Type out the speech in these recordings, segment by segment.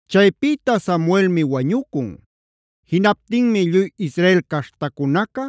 Chaypïta Samuelmi wañucun. Jinaptinmi lluy Israel caśhtacunaca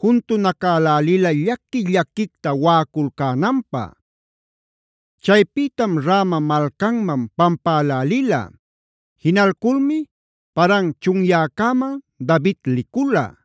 juntunacalälila llaqui-llaquicta waꞌaculcänanpä. Chaypïtam Rama malcanman pampälälila. Jinalculmi Paran chunyäcäman David licula.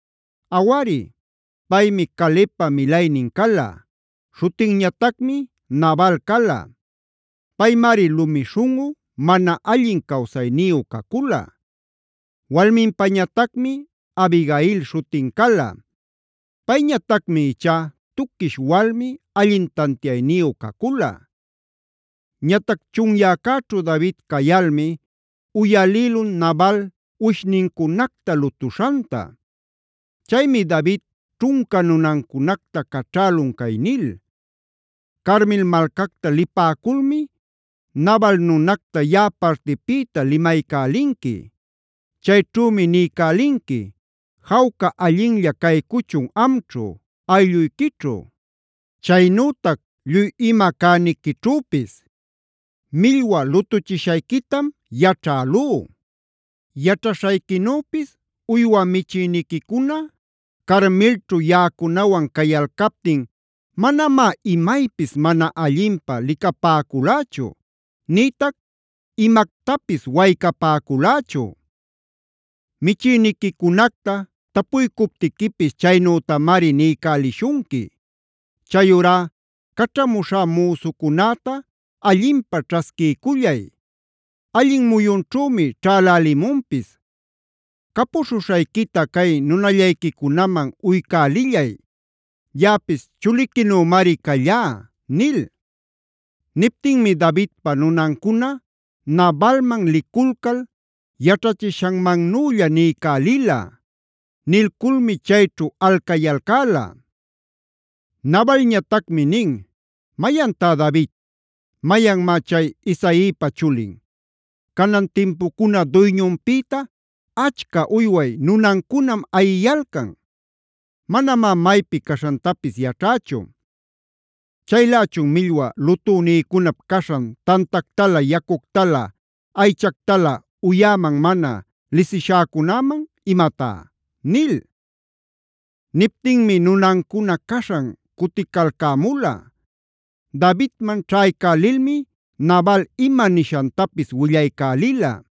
Awari, paymi Calebpa milaynin cala; śhutinñatacmi Nabal cala. Paymari lumi śhunꞌu, mana allin cawsayniyu cacula. Walminpañatacmi Abigail śhutin cala. Payñatacmi ichá tuquish walmi, allin tantiayniyu cacula. Ñatac chunyäcäćhu David cayalmi uyalïlun Nabal uwishnincunacta lutuśhanta. Chaymi David ćhunca nunancunacta caćhälun cay nil: “Carmel malcacta lipäculmi Nabal nunacta yaꞌa partipïta limaycälinqui. Chayćhümi niycälinqui: ‘Jawca allinlla caycuchun amćhu, aylluyquićhu, chaynütac lluy ima cäniquićhüpis. Millwa lutuchishayquitam yaćhälú. Yaćhaśhayquinüpis uywa michïniquicuna Carmelćhu yaꞌacunawan cayalcaptin manamá imaypis mana allinpä licapäculächu, nïtac imactapis waycapäculächu. Michïniquicunacta tapuycuptiquipis chaynütamari niycälishunqui. Chayurá caćhamuśhá müsucunäta allinpä ćhasquiycullay; allin muyunćhümi ćhälälimunpis. Capuśhuśhayquita cay nunayllayquicunaman uycälillay. Yaꞌapis chuliquinümari callá’” nil. Niptinmi Davidpa nunancuna Nabalman liculcal yaćhachishanmannülla niycälila. Nilculmi chayćhu alcayalcäla. Nabalñatacmi nin: “¿¡Mayantá David!? ¿Mayanmá chay Isaipa chulin? Canan timpucuna duyñunpïta achca uyway nunancunam ayiyalcan. Manamá maypi caśhantapis yaćhächu. Chaylächun ¿millwa lutünïcunap caśhan tantactalä, yacuctalä, aychactalä uyäman mana lisishäcunaman imatá?” nil. Niptinmi nunancuna caśhan cuticalcämula. Davidman ćhaycälilmi Nabal ima nishantapis willaycälila.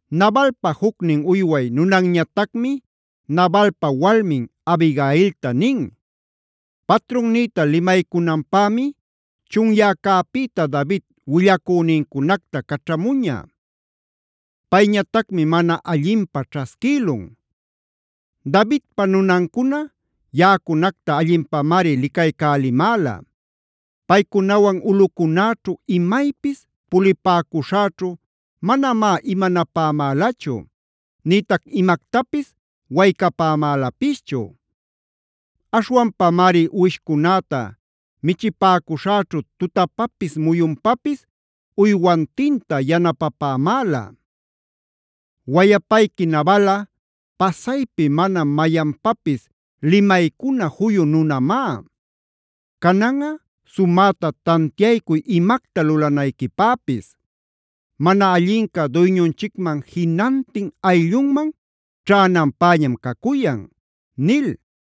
Nabalpa jucnin uyway nunanñatacmi Nabalpa walmin Abigailta nin: “Patrunnïta limaycunanpämi chunyäcäpïta David willacünincunacta caćhamuña. Payñatacmi mana allinpä ćhasquïlun. Davidpa nunancuna yaꞌacunacta allinpamari licaycälimäla. Paycunawan ulꞌucunäćhu imaypis pulipäcuśhäćhu manamá imanapämälachu nïtac imactapis waycapämälapischu. Aśhwanpamari uwishcunäta michipäcuśhäćhu tutapapis muyunpapis uywantinta yanapapämäla. Wayapayqui Nabalꞌa pasaypi mana mayanpapis limaycuna juyu nunamá. Cananꞌa sumäta tantiaycuy imacta lulanayquipäpis. Mana allinca duyñunchicman jinantin ayllunman ćhänanpäñam cacuyan” nil.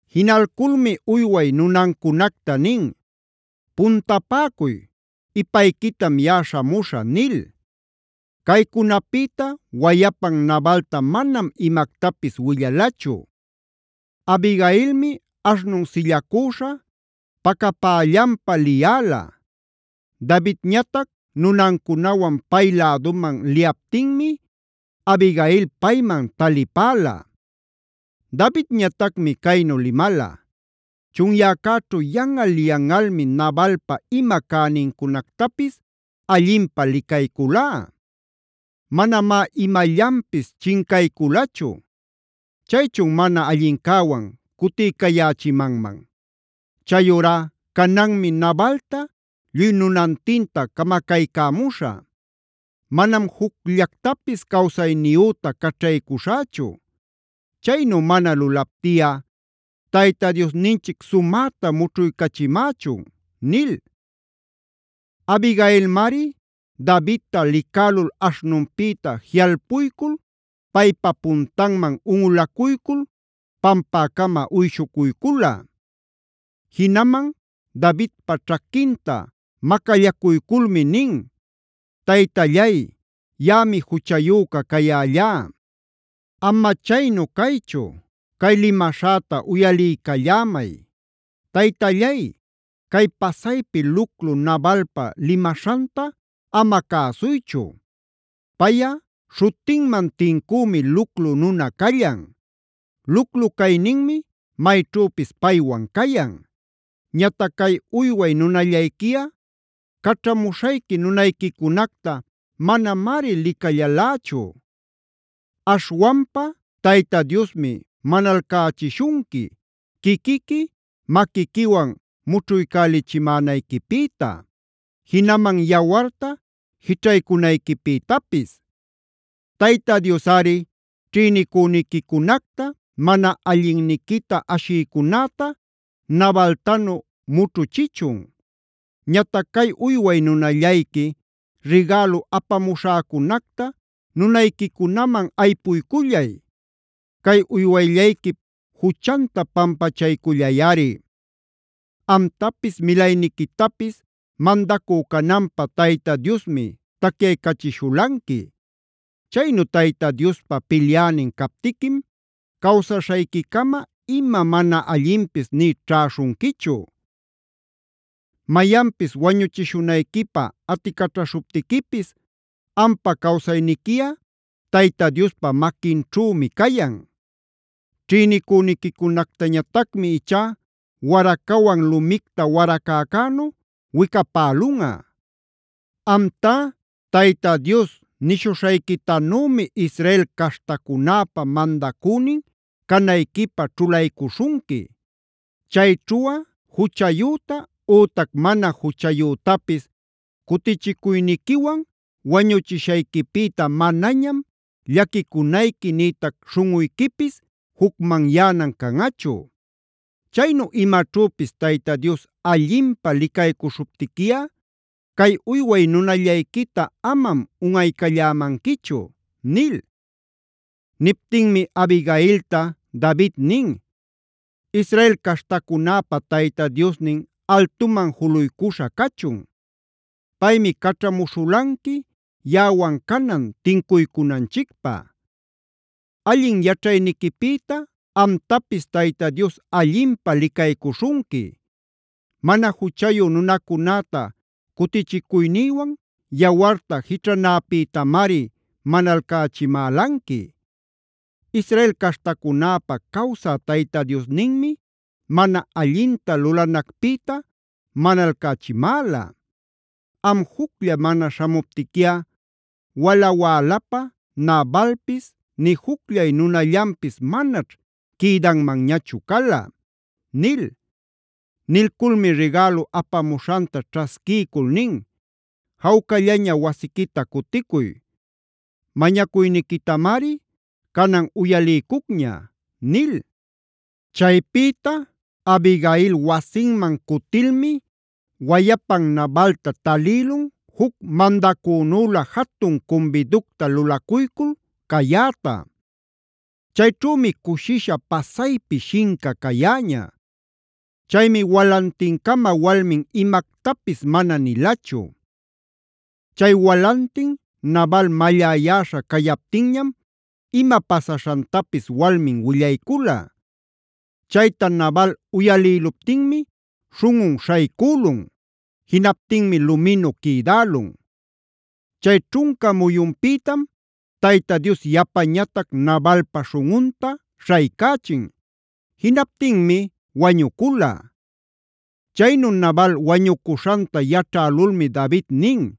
Jinalculmi uyway nunancunacta nin: “Puntapäcuy; ipayquitam yaꞌa śhamuśhä” nil. Caycunapïta wayapan Nabalta manam imactapis willalachu. Abigailmi aśhnun sillacüśha pacapällanpa liyäla. Davidñatac nunancunawan pay läduman liyaptinmi Abigailꞌa payman talipäla. Davidñatacmi caynu limala: “Chunyäcäćhu yanꞌal-yanꞌalmi Nabalpa ima cänincunactapis allinpä licayculá. Manamá imallanpis chincayculachu. Chaychun mana allincäwan cutiycayächimanman. Chayurá cananmi Nabalta lluy nunantinta camacaycämuśhä. Manam jucllactapis cawsayniyüta caćhaycuśhächu. Chaynu mana lulaptiꞌa Tayta Diosninchic sumäta mućhuycachimächun” nil. Abigailmari Davidta licälul aśhnunpïta jiꞌalpuycul paypa puntanman unꞌulacuycul pampäcama uyshucuycula. Jinaman Davidpa ćhaquinta macallacuyculmi nin: “Taytallay, yaꞌami juchayüca cayällá. Ama chaynu caychu, cay limäśhäta uyaliycallämay. Taytallay, cay pasaypi luclu Nabalpaa limaśhanta ama cäsuychu. Payꞌa śhutinman tincümi luclu nuna callan. Luclu cayninmi mayćhüpis paywan cayan. Ñatac cay uyway nunallayquiꞌa caćhamuśhayqui nunayquicunacta manamari licallalächu. “Aśhwanpa Tayta Diosmi manalcächishunqui quiquiqui maquiquiwan mućhuycälichimänayquipïta, jinaman yawarta jićhaycunayquipïtapis. Tayta Diosꞌari ćhïnicüniquicunacta, mana allinniquita ashïcunäta Nabaltanu mućhuchichun. Ñatac cay uyway nunallayqui rigälu apamuśhäcunacta nunayquicunaman aypuycullay. Cay uywayllayquip juchanta pampachaycullayꞌari. Amtapis milayniquitapis mandacü cananpä Tayta Diosmi tacyaycachishulanqui. Chaynu Tayta Diospä pilyänin captiquim cawsaśhayquicama ima mana allinpis nï ćhäśhunquichu. Mayanpis wañuchishunayquipä aticaćhaśhuptiquipis ampa cawsayniquiꞌa Tayta Diospa maquinćhümi cayan. Ćhïnicüniquicunactañatacmi ichá waracawan lumicta waracäcänu wicapälunꞌa. Amtá Tayta Dios nishuśhayquitanümi Israel caśhtacunäpä mandacünin canayquipä ćhulaycuśhunqui. Chayćhuꞌa juchayüta ütac mana juchayütapis cutichicuyniquiwan wañuchishayquipïta manañam llaquicunayqui nïtac śhunꞌuyquipis jucmanyänan canꞌachu. Chaynu imaćhüpis Tayta Dios allinpä licaycuśhuptiquiꞌa cay uyway nunallayquita amam unꞌaycallämanquichu” nil. Niptinmi Abigailta David nin: “Israel caśhtacunäpa Tayta Diosnin altuman juluycuśha cachun. Paymi caćhamuśhulanqui yaꞌawan canan tincuycunanchicpä. Allin yaćhayniquipïta amtapis Tayta Dios allinpä licaycuśhunqui. Mana juchayu nunacunäta cutichicuynïwan yawarta jićhanäpïtamari manalcachimälanqui. Israel caśhtacunäpä cawsä Tayta Diosninmi mana allinta lulanacpïta manalcachimäla. Am juclla mana śhamuptiquiꞌa wala-wälapä Nabalpis nï jucllay nunallanpis manaćh quïdanmanñachu cala” nil. Nilculmi rigälu apamuśhanta ćhasquiycul nin: “Jawcallaña wasiquita cuticuy. Mañacuyniquitamari canan uyaliycucña” nil. Chaypïta Abigail wasinman cutilmi wayapan Nabalta talïlun juc mandacünülä jatun cumbiducta lulacuycul cayäta. Chayćhümi cushisha pasaypi shinca cayäña. Chaymi walantincama walmin imactapis mana nilachu. Chay walantin Nabal malläyäśha cayaptinñam ima pasaśhantapis walmin willaycula. Chayta Nabal uyalïluptinmi śhunꞌun śhaycülun; jinaptinmi luminu quïdälun. Chay ćhunca muyunpïtam Tayta Dios yapañatac Nabalpa śhunꞌunta śhaycächin; jinaptinmi wañucula. Chaynu Nabal wañucuśhanta yaćhälulmi David nin: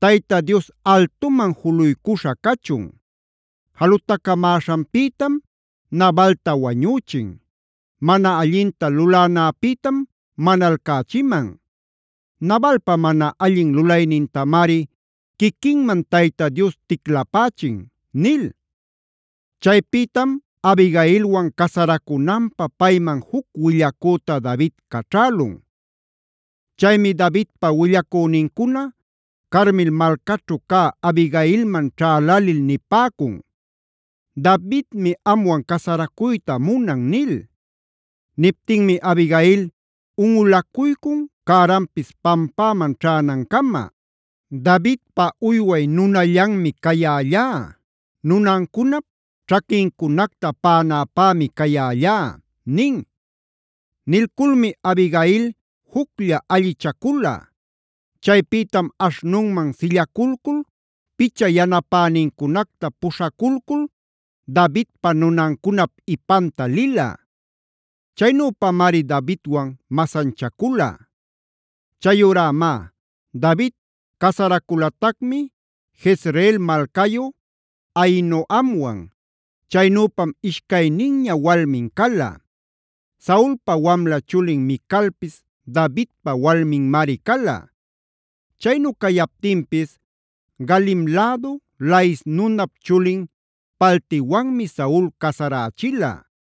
Tayta Dios altuman juluycuśha cachun. Jalutacamäśhanpïtam Nabalta wañüchin; mana allinta lulanäpïtam manalcächiman. Nabalpa mana allin lulaynintamari quiquinman Tayta Dios ticlapächin” nil. Chaypïtam Abigailwan casaracunanpä payman juc willacüta David caćhälun. Chaymi Davidpa willacünincuna Carmel malcaćhu cä Abigailman ćhälälil nipäcun: “Davidmi amwan casaracuyta munan” nil. Niptinmi Abigail unꞌulacuycun cäranpis pampäman ćhänancama: “Davidpa uyway nunallanmi cayällá. Nunancunap ćhaquincunacta paꞌanäpämi cayällá” nin. Nilculmi Abigail juclla allichacula. Chaypïtam aśhnunman sillaculcul picha yanapänincunacta puśhaculcul Davidpa nunancunap ipanta lila. Chaynüpamari Davidwan masanchacula. Chayurá má, David casaraculatacmi Jezreel malcayu Ahinoamwan. Chaynüpam ishcayninña walmin cala. Saulpa wamla chulin Micalpis Davidpa walminmari cala. Chaynu cayaptinpis Galim lädu Lais nunap chulin Paltiwanmi Saul casarächila.